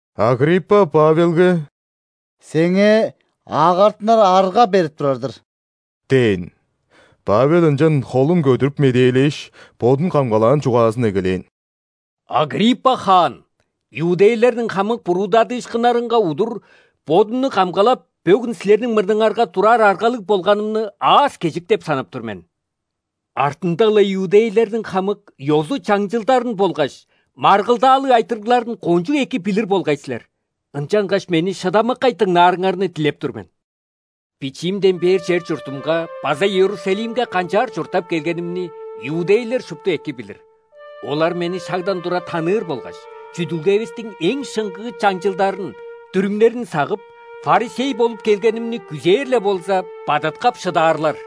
Агриппа Павелге: «Сеңээ агартынар арга берип турар-дыр» – дээн. Павел ынчан холун көдүрүп медээлээш, бодун камгалаан чугаазын эгелээн: «Агриппа хаан! Иудейлерниң хамык буруудадыышкыннарынга удур бодумну камгалап, бөгүн силерниң мурнуңарга турар аргалыг болганымны аас-кежик деп санап тур мен. Артында-ла иудейлерниң хамык ёзу-чаңчылдарын болгаш маргылдаалыг айтырыгларын кончуг эки билир болгай силер. Ынчангаш мени шыдамыккай дыңнаарыңарны дилеп тур мен. Бичиимден бээр чер-чуртумга база Иерусалимге канчаар чурттап келгенимни иудейлер шупту эки билир. Олар мени шагдан тура таныыр болгаш, чүдүлгевистиң эң шыңгыы чаңчылдарын, дүрүмнерин сагып, ·фарисей болуп келгенимни, күзээр-ле болза, бадыткап шыдаарлар.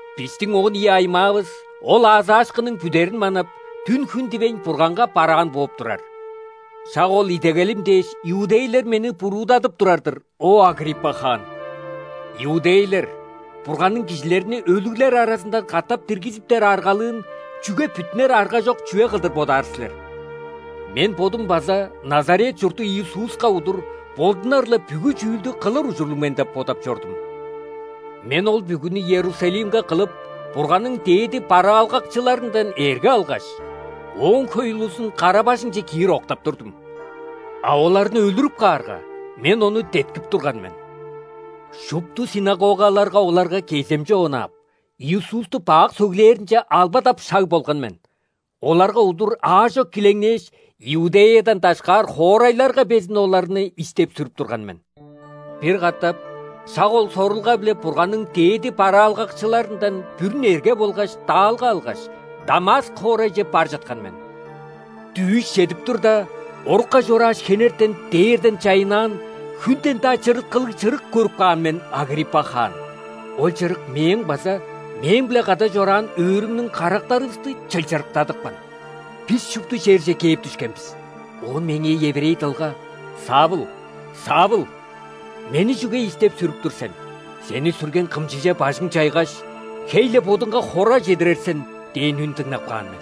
Бистиң он ийи аймаавыс ол аазаашкынның бүдерин манап, дүн-хүн дивейн, Бурганга бараан бооп турар. Шак ол идегелим дээш, иудейлер мени буруудадып турар-дыр, о, Агриппа хаан! Иудейлер, Бурганның кижилерни өлүглер аразындан катап диргизиптер аргалыын чүге бүттүнер аргажок чүве кылдыр бодаар силер? Мен бодум база Назарет чурттуг Иисуска удур болдунар-ла бүгү чүүлдү кылыр ужурлуг мен деп бодап чордум. Мен ол бүгүнү Иерусалимге кылып, Бурганның дээди бараалгакчыларындан эрге алгаш, Ооң хөй улузун кара-бажыңче киир октап турдум. А оларны өлүрүп каарга, мен ону деткип турган мен. Шупту ·синагогаларга оларга кеземче онаап, Иисусту бак сөглээринче албадап шаг болган мен. Оларга удур аажок килеңнээш, Иудеядан дашкаар хоорайларга безин оларны истеп-сүрүп турган мен. Бир катап шак ол сорулга-биле Бурганның дээди бараалгакчыларындан бүрүн эрге болгаш даалга алгаш, Дамаск хоорайже бар чыткан мен. Дүъш чедип турда, орукка чорааш, хенертен дээрден чайыннаан, хүнден-даа чырыткылыг чырык көрүп каан мен, Агриппа хаан. Ол чырык мээң база мээң-биле кады чораан өөрүмнүң карактарывысты чылчырыктадыпкан. Бис шупту черже кээп дүшкен бис, оон меңээ еврей дылга: „Савл! Савл! Мени чүге истеп-сүрүп тур сен? Сени сүрген кымчыже бажың чайгаш, хей-ле бодуңга хора чедирер сен“ – дээн үн дыңнап каан мен.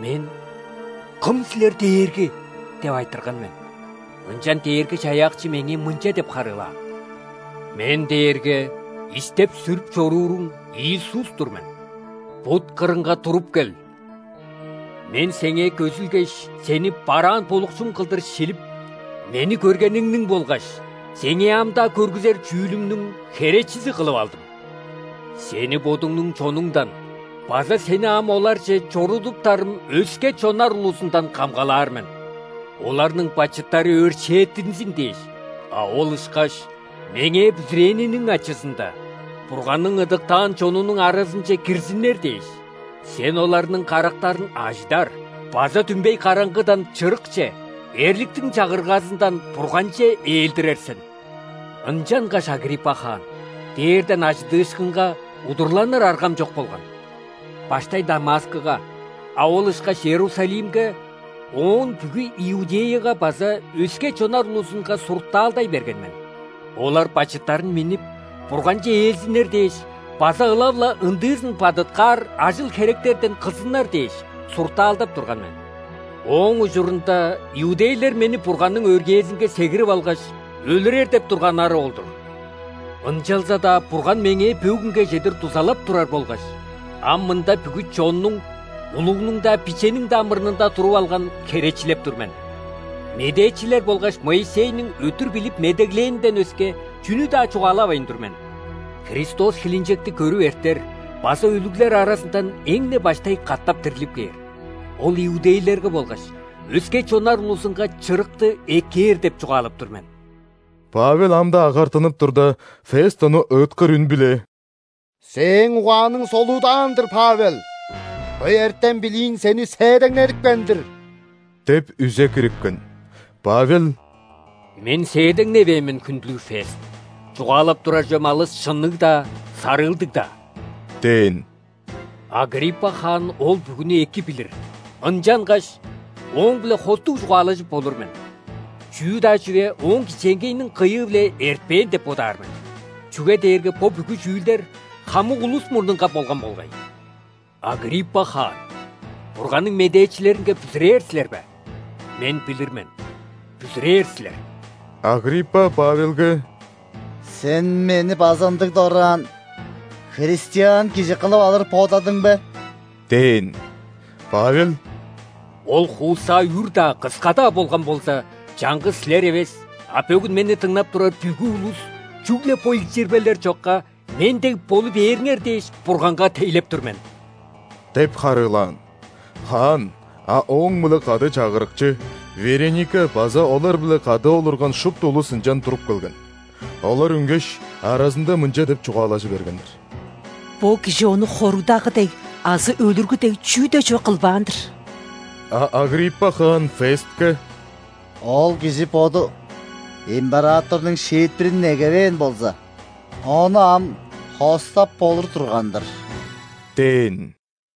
Мен: „Кым силер, Дээрги?“ – деп айтырган мен. Ынчан Дээрги-Чаяакчы меңээ мынча деп харыылаан: „Мен дээрге истеп-сүрүп чорууруң Иисус-тур мен. Бут кырынга туруп кел. Мен сеңээ көзүлгеш, сени бараан болукчум кылдыр шилип, Мени көргениңниң болгаш сеңээ ам-даа көргүзер чүүлүмнүң херечизи кылып алдым. Сени бодуңнуң чонуңдан база сени ам оларже чорудуптарым өске чоннар улузундан камгалаар мен. Оларның бачыттары өршээттинзин дээш, а ол ышкаш Меңээ бүзүрээниниң ачызында Бурганның ыдыктаан чонунуң аразынче кирзиннер дээш, сен оларның карактарын ажыдар база дүмбей караңгыдан – чырыкче, эрликтиң чагыргазындан – Бурганче ээлдирер сен“. Ынчангаш, Агриппа хаан, дээрден ·ажыдыышкынга удурланыр аргам чок болган. Баштай Дамаскыга, а ол ышкаш Иерусалимге, оон бүгү Иудеяга база өске чоннар улузунга суртаалдай берген мен. Олар бачыттарын миннип, Бурганче ээлзиннер дээш база ылап-ла ындыызын бадыткаар ажыл-херектерден кылзыннар дээш, суртаалдап турган мен. Ооң ужурунда иудейлер мени Бурганның өргээзинге сегирип алгаш, өлүрер деп турганнары ол-дур. Ынчалза-даа Бурган меңээ бөгүнге чедир дузалап турар болгаш, ам мында бүгү чоннуң – улугнуң-даа, бичениң-даа мурнунда туруп алган, херечилеп тур мен. Медээчилер болгаш Моисейниң өттүр билип медеглээнинден өске чүнү-даа чугаалавайн тур мен: Христос хилинчекти көрүп эртер база өлүглер аразындан эң-не баштай катап дирлип кээр, Ол иудейлерге болгаш өске чоннар улузунга чырыкты эккээр деп чугаалап тур мен». Павел ам-даа агартынып турда, Фест ону ыыткыр үн-биле: «Сээң угааның солуудаан-дыр, Павел! Хөй эртем-билииң сени сээдеңнедипкен-дир!» – деп үзе кирипкен. Павел: «Мен сээдеңневээн мен, хүндүлүг Фест, чугаалап турар чүвем алыс шынныг-даа, сарыылдыг-даа – дээн. – Агриппа хаан ол бүгүнү эки билир, ынчангаш ооң-биле хостуг чугаалажып болур мен. Чүү-даа чүве ооң кичээнгейиниң кыйыы-биле эртпээн деп бодаар мен, чүге дээрге бо бүгү чүүлдер хамык улус мурнунга болган болгай. Агриппа хаан! Бурганның медээчилеринге бүзүрээр силер бе? Мен билир мен – бүзүрээр силер». Агриппа Павелге: «Сен мени база ындыг дораан христиан кижи кылып алыр бодадың бе?» – дээн. Павел: «Ол хуусаа үр-даа, кыска-даа болган болза, чаңгыс силер эвес, а бөгүн мени дыңнап турар бүгү улус, чүгле бо илчирбелер чокка, мен дег болу бээриңер дээш, Бурганга тейлеп тур мен» – деп харыылаан. Хаан, а ооң-биле кады чагырыкчы, Вереника база олар-биле кады олурган шупту улус ынчан туруп келген. Олар үнгеш, аразында мынча деп чугаалажы бергеннер: «Бо кижи ону хоругдагы дег азы өлүргү дег чүү-даа чүве кылбаан-дыр». А Агриппа хаан Фестке: «Ол кижи боду императорнуң шиитпирин негевээн болза, ону ам хостап болур турган-дыр» – дээн.